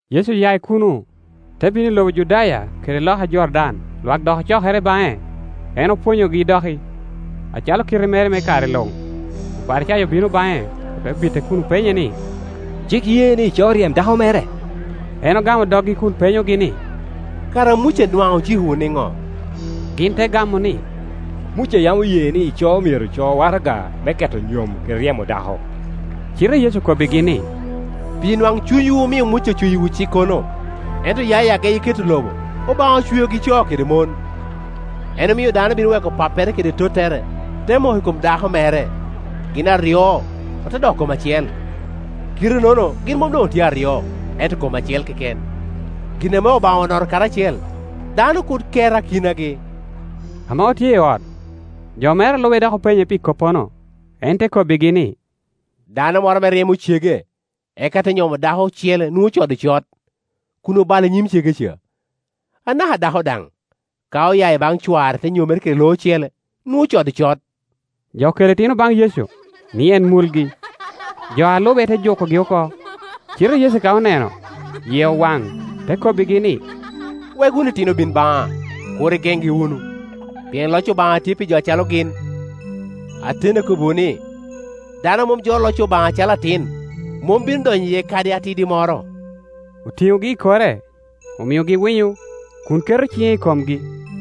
Yecu oya i kuno, te bino i lobo Judaya kede loka Jordan. Lwak dok ocokere baŋe, en opwonyogi doki, acalo kite mere me kare luŋ. Oparicayo obino baŋe, ote bite kun openye ni, “Cik ye ni ico ryem dako mere?” En ogamo doggi kun penyogi ni, “Kara Muca nwaŋ ocikowu niŋo?” Gin te gamo ni, “Muca yam oye ni ico myero co waraga me keto nyom, kede ryemo dako.” Cite Yecu okobbigi ni, “Pi nwaŋcunywu omio Muca ocoyiwu cikkono. Ento ya i ageyi keto lobo, ‘Obaŋa ocweogi co kede mon. En omio dano bino weko pappere kede tottere, te moko i kom dako mere, gin aryo ote doko kom acel.’ Kite-nono gin mom doŋ otye aryo, ento kom acel keken. Gin ame Obaŋa onoto karacel, dano kur ket akinagi.” Ame otye i ot, jo mere a lube dok openye pi koppono. Kor. 7.10-11En te kobbigi ni, “Dano moro ame ryemo cege, eka te nyomo dako ocele nwoŋo ocodo cot, kun obalo i nyim cege ca. Anaka dako daŋ, ka oya i baŋ cware te nyomere kede lo ocele, nwoŋo ocodo cot.” Jo okelo itino baŋ Yecu, ni en mulgi. Jo a Lube te jukogi oko; cite Yecu ka oneno, yie owaŋ, te kobbigi ni, “Wek wunu itino bin baŋa, kur igeŋgi wunu; pien loc Obaŋa tye pi jo acalo gin. Ateni akobbiwu ni, dano a mom jolo loc Obaŋa acalo atin, mom bino donyo iye kadi atidi moro.” Otiŋogi i kore, omiogi winyo, kun keto ciŋe i komgi.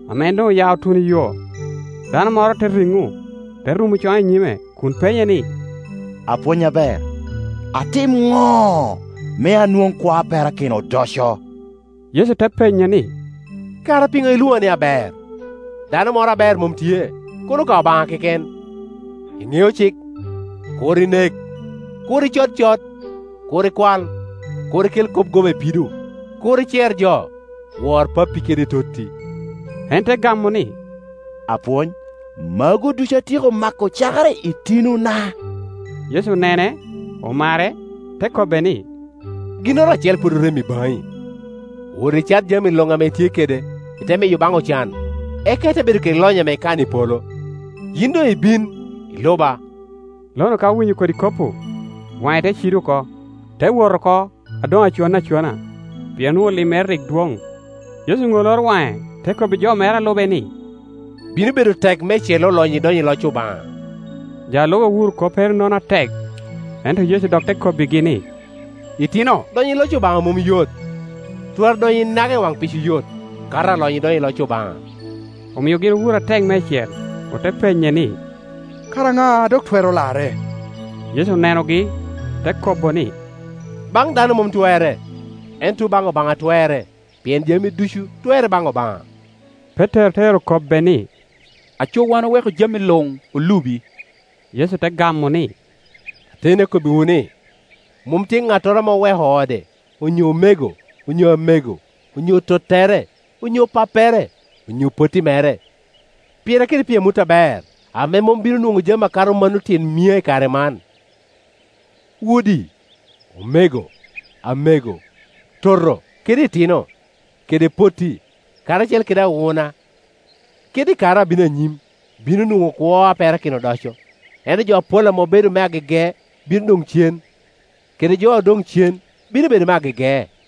Ame en doŋ oya otuno iyo, dano moro te riŋo, te rumo coŋe i nyime kun penye ni, “Apwony aber, atim ŋo me anwoŋ kwo a perakino odoco?” Yecu te penye ni, “Kara piŋo ilwoŋa ni aber? Dano moro aber mom tye, kono ka Obaŋa keken. Iŋeo cik, ‘Kur inek, Kur icod cot, Kur ikwal, Kur ikel kop goba i pido, Kur icer jo, Wor pappi kede totti.’” En te gamo ni, “Apwony, magu ducu atyeko mako cakere i tinona.” Yecu onene, omare, te kobbe ni, “Ginnoro acel pwod orem i baŋi. Wot icaŋami luŋ ame itye kede, ite miyo baŋ ocan, eka ite bedo kede lonyo ame ikano i polo; yin doŋ ibin, iluba.” Lonu ka owinyo kodi kop-pu, waŋe te cido oko, te wot oko a doŋ aconne acona, pien onwoŋo limmere rik dwoŋ. Yecu oŋoloro waŋe te kobbi jo mere a lube ni, “Bino bedo tek meicel olonyo idonyo i loc Obaŋa!” Jo a lube owuro koppere-nono atek, ento Yecu dok te kobbigi ni, “Itino, donyo i loc Obaŋa mom yot! Twara donyo inaga i waŋ pico yot, kato alonyo idonyo i loc Obaŋa!” Omio gin owuro atek meicel, ote penye ni, “Kara ŋa a dok twero larre?” Yecu onenogi, te kobo ni, “Baŋ dano mom twerre, ento tuŋ baŋ Obaŋa twerre, pien jami ducu twerre baŋ Obaŋa.” Petero te ero kobbe ni, “Aco wan oweko jami luŋ, olubi.” Yecu te gamo ni, “Ateni akobbiwu ni, mom tye ŋattoro ame oweko ode, onyo omego, onyo amego, onyo tottere, onyo pappere, onyo potti mere, pira kede pi amut aber, ame mom bino nwoŋo jami akato mano tyen mia i kare man, udi, omego, amego, toto, kede itino, kede potti, karacel kede awuna; kede i kare abino anyim bino nwoŋo kwo a perakino odoco. Ento jo apol ame obedo me agege bino doŋ cen, kede jo odoŋ cen bino bedo me agege.”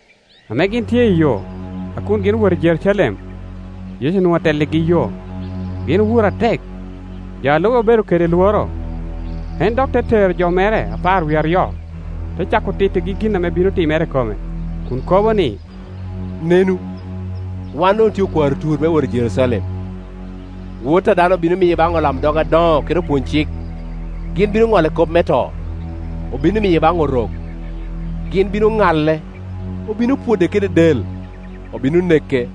Ame gin tye iyo, a kun gin owot i Jerucalem, Yecu onwoŋo atelligi yo; gin owuro atek, jo a lube obedo kede lworo. En dok te tero jo mere apar wie aryo, te cako tittigi gin ame bino timere i kome, kun kobo ni, “Nenu, wan doŋ otye okwaro tur me wot i Jerucalem. Wot a dano obino miye baŋ olamdog adoŋo kede opwony-cik, gin bino ŋolle kop me to, obino miye baŋ Orok. Gin bino ŋale, obino pwode kede del, obino neke;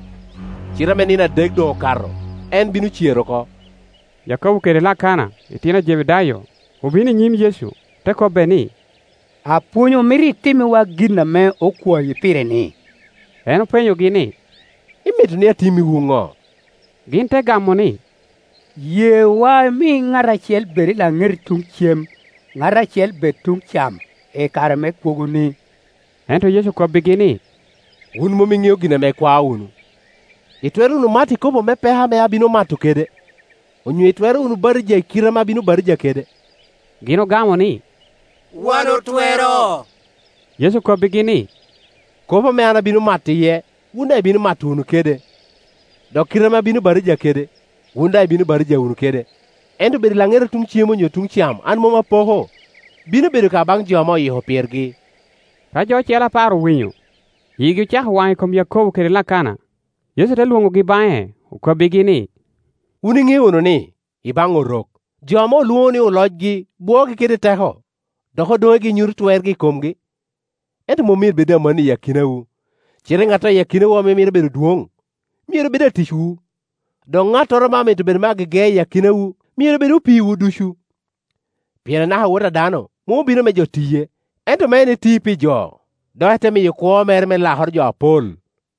cite ame nino adek doŋ okato, en bino cer oko.” Yakobo kede Lakana, itino a Jebedayo, obino i nyim, Yecu, ote kobbe ni, “Apwony omito itimmiwa gin ame okwayi pire-ni.” En openyogi ni, “Imito ni atimmiwu ŋo?” Gin te gamo ni, “Yewa imi ŋat acel bed i laŋeti tuŋ cem, ŋat acel bed tuŋ cam, i kare me kwogoni.” Ento Yecu okobbigi ni, “Wun mom iŋeo gin ame ikwao wunu. Itwero wunu mato i kopo me peko ame abino mato kede; onyo itwero wunu batija i kite ame abino batija kede?” Gin ogamo ni, “Wan otwero.” Yecu okobbigi ni, “Kopo ame an abino mato iye, wun daŋ ibino mato wunu kede; dok kite ame an abino batija kede, wun daŋ ibino batija wunu kede; ento bedo i laŋeta tuŋ cem onyo tuŋ cam an mom apoko. Bino bedo ka baŋ jo ame oyiko pirgi.” Ka jo ocele apar owinyo, igi ocako waŋ i kom Yakobo kede Lakana. Yecu te lwonogi baŋe, okobbigi ni, “Wun iŋeo wunu ni, i baŋ Orok, jo ame olwoŋo ni olocgi bwoogi kede teko, dok odonegi nyuto twergi i komgi. Ento mom myero bed amannono i akinawu; cite ŋattoro i akinawu ame mito bedo adwoŋ, myero bed aticwu; dok ŋattoro ame amito bedo me agege i akinawu, myero bed opiiwu ducu. Pien anaka Wot a dano mom obino me jo tiye, ento me en ti pi jo, dok ete miyo kwo mere me lakoro jo apol.”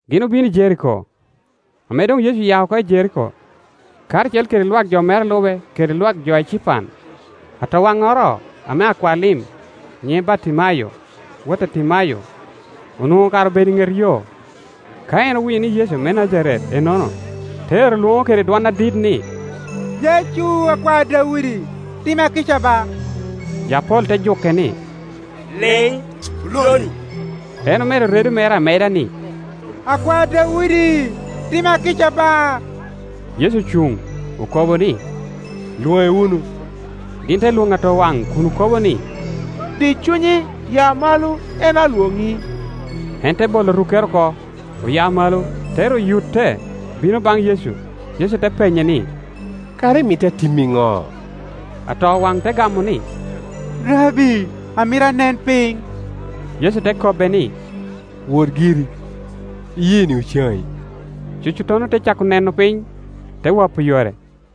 Gin obino i Jeriko. Ame doŋ Yecu aya oko i Jeriko, karacel kede jo mere a lube kede lwak jo ecipan, atowaŋŋoro ame akwa lim, nyiŋe Bartimayo, wot a Timayo, onwoŋo kara obedo i ŋet yo. Ka en owinyo ni Yecu me Najaret ennono, te ero lwoŋo kede dwon adit ni, “Yecu, Akwar Daudi, tima kica ba!” Jo apol te juke ni, “Liŋ, lo-ni!” En omedo redo mere ameda ni, “Akwar Daudi, tima kica ba!” Yecu Ocuŋ, okobo ni, “Lwoŋe wunu.” Gin te lwoŋo atowaŋ kun okobo ni, “Di cunyi, ya malo, en alwoŋi.” En te bolo rukkere oko, oya malo, te ru yutte, bino baŋ Yecu. Yecu te penye ni, “Kara imito atimi ŋo?” Atowaŋ te gamo ni, “Rabbi, amito anen piny.” Yecu te kobbe ni, “Wot giri, iyeeni ocaŋi.” Cucuttono te cako neno piny, te wapo yore.